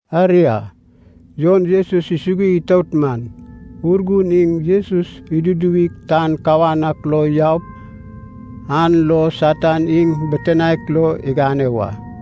Aria, Jon Jesus isugui itout man, Urgun iŋ Jesus iduduwig tan kawan ak lo yaup an lo Satan iŋ bitinaek lo igane wa.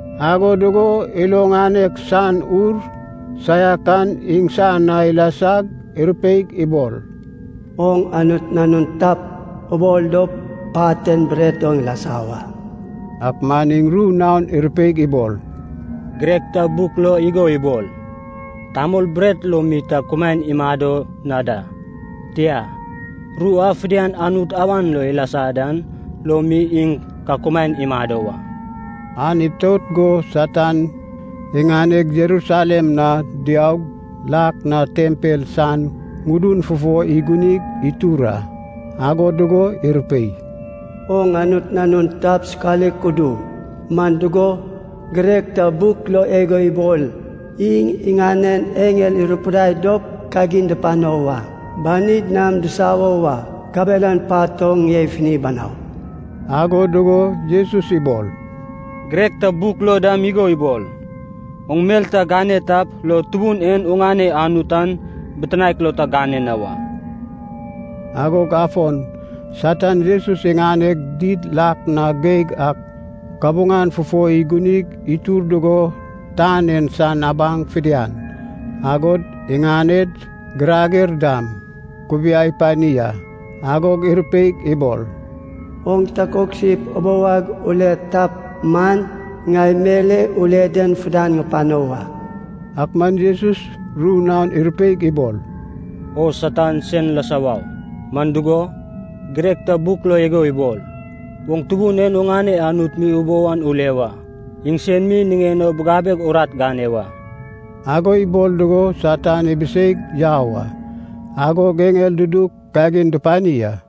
Ago dugo ilo ŋanek san ur saiak an iŋsan na ilasag irupeig ibol, “Oŋ Anut Nanun tap, ubol dop pat en bret oŋ ibili wa.” Ak man iŋ ru naon irupeig ibol, “Girek ta buk lo igo ibol, tamol bret lo mi ta kumaen imado na da, tia, ru a fidian Anut awan lo ilasa dan lo mi iŋ ka kumaen imado wa.” An itout go Satan iŋaneg Jerusalem na diaug, lak na tempel san ŋudun fufo igunig itur a. Ago dugo irupei, “Oŋ Anut Nanun tap sokalik udu, man dugo, girek ta buk lo igo ibol, ‘Iŋ iŋanen eŋel irupidai dop kagin dupano wa. Banid nam disawo wa, kabelan pat oŋ ŋie ifini banau.’” Ago dugo Jesus ibol, “Girek ta buk lo dam igo ibol, oŋ mel ta gane tap lo Tubun en oŋane Anut an bitinaek lo ta gane na wa.” Agog afon Satan Jesus iŋaneg did lak na geig ak kabuŋan fufo igunig itur dugo tan en san abaŋ fidian, agod iŋaned girager dam, ikubiai pani a. Agog irupeig ibol, “Oŋ takoksip ubou ag ule tap man, ŋai mel e ule den fidian ŋupano wa.” Ak man Jesus ru naon irupeig ibol, “O Satan sen lasa wau! Man dugo, girek ta buk lo igo ibol, ‘Oŋ Tubun en oŋane Anut mi ubou an ule wa. Iŋsen mi niŋen o bigabeg urat gane wa.’” Ago ibol dugo Satan ibiseig yau a. Agog eŋel dudug kagin dupani a.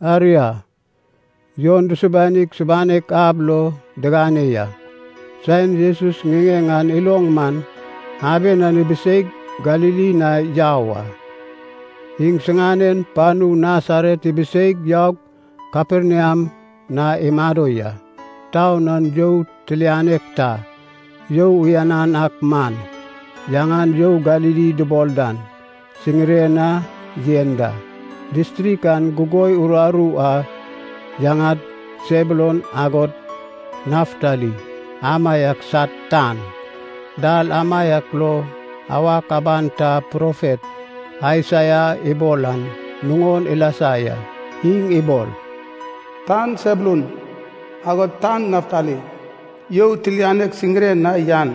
Aria, Jon dusubanig subanek ab lo digane ya. Saen Jesus ŋiŋeŋ an iloŋ man aben an ibiseig Galili na yau a. Iŋsiŋanen panu Nasaret ibiseig, yaug Kaperniam na imado ya. Taun an you tilianek ta, you uyanan ak man, yaŋan You Galili dubol dan, siŋiren na yen da. Distrik an gugoi uraru a yaŋad Sebulun agod Naftali amaiak sad tan. Dal amaiak lo awak aban ta profet Aisaia ibol an nuŋon ilasa ya. Iŋ ibol, “Tan Sebulun agod tan Naftali, you tilianek siŋiren na yan,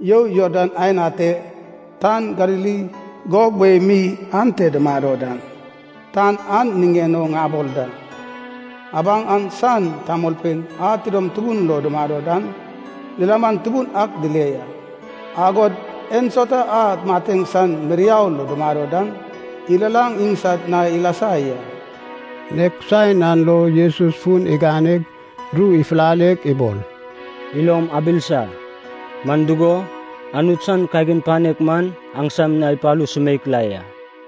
you Jordan aen ate, tan Galili gob wei mi ante dumado dan, tan an niŋen o ŋabol da. Abaŋ an san tamolpein a tidom tubun lo dumado dan, lilaman tubun ak dile ya. Agod ensauta a mateŋ san miriau lo dumado dan, ilalaŋ iŋsad na ilasa ya.” Nek saen an lo Jesus fun iganeg ru ifulaleg ibol, “Ilom abilisa, man dugo, Anut san kagin panek man aŋsam na ipalu sumeik la ya.”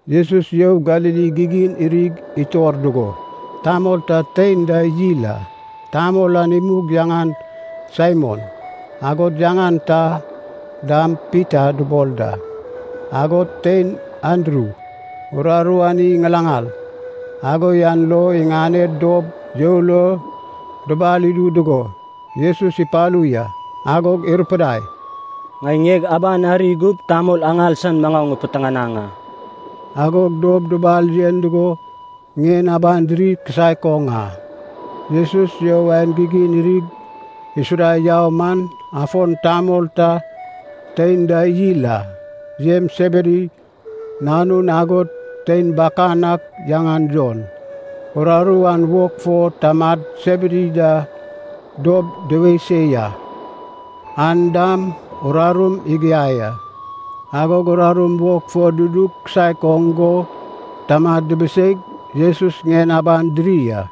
Jesus You Galili gigin irig itor dugo tamol ta tein da yil a. Tamol an imug yaŋan Saimon, agod yaŋan ta dam Pita dubol da. Agod tein Andru. Uraru an iy ŋalaŋal, ago yan lo iŋaned dob you lo dubal idu dugo, Jesus ipalu ya. Agog irupidai, “Ŋai ŋieg abag ari gup tamol aŋal san maŋau ŋipiteŋanaŋ a.” Agog dob dubal yen dugo ŋien aban diri kisaek oŋ a. Jesus you aen gigin irig isuda yau man afon tamol ta tein da yil a, Jems Sebedi nanun agod tein bakanan ak yaŋan Jon, uraru an wog fo tamad Sebedi da dob duwei se ya. An dam urarum igiai a. Agog urarum wog fo dudu kisaek oŋ go tamad dibiseig Jesus ŋien aban diri a.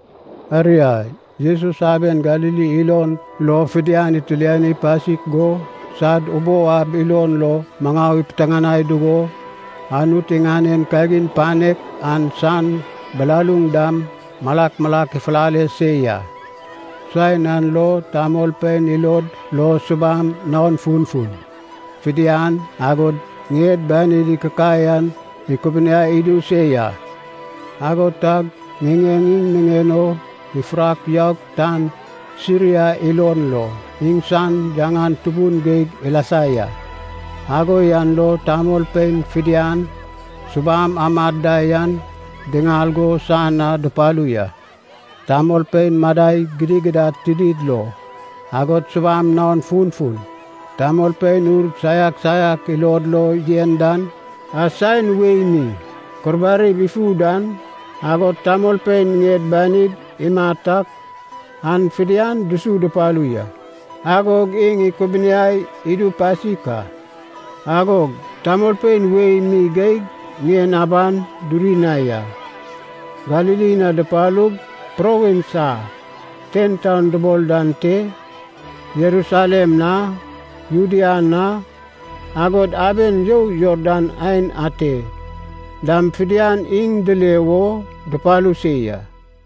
Aria Jesus aben Galili ilon lo fidian itiliani pasik go sad ubou ab ilon lo maŋau ipiteŋanai dugo, Anut iŋanen kagin panek an san bilaluŋ dam malak malak ifulale se ya. Saen an lo tamolpein ilod lo subam naon funfun fidian agod ŋied banid ikikai an ikubuniai idu se ya. Ago tag ŋiŋeŋ iŋ niŋen o ifurak yaug tan Siria ilon lo iŋsan yaŋan tubun geig ilasa ya. Ago yan lo tamolpein fidian subam amad da yan diŋal go san na dupalu ya. Tamolpein madai gidigidad tinid lo, agod subam naon funfun, tamolpein ur saiak saiak ilod lo yen dan, a saen wei mi kurbarib ifu dan, agod tamolpein ŋied banidi imat ak an fidian dusu dupalu ya, agog iŋ ikubuniai idu pasik a. Agog tamolpein wei mi geig ŋien aban duri na ya. Galili na dipalug, provins a TenTaun dubol dan te, Jerusalem na, Judea na, agod aben you Jordan aen ate dam fidian iŋ dile wo dupalu se ya.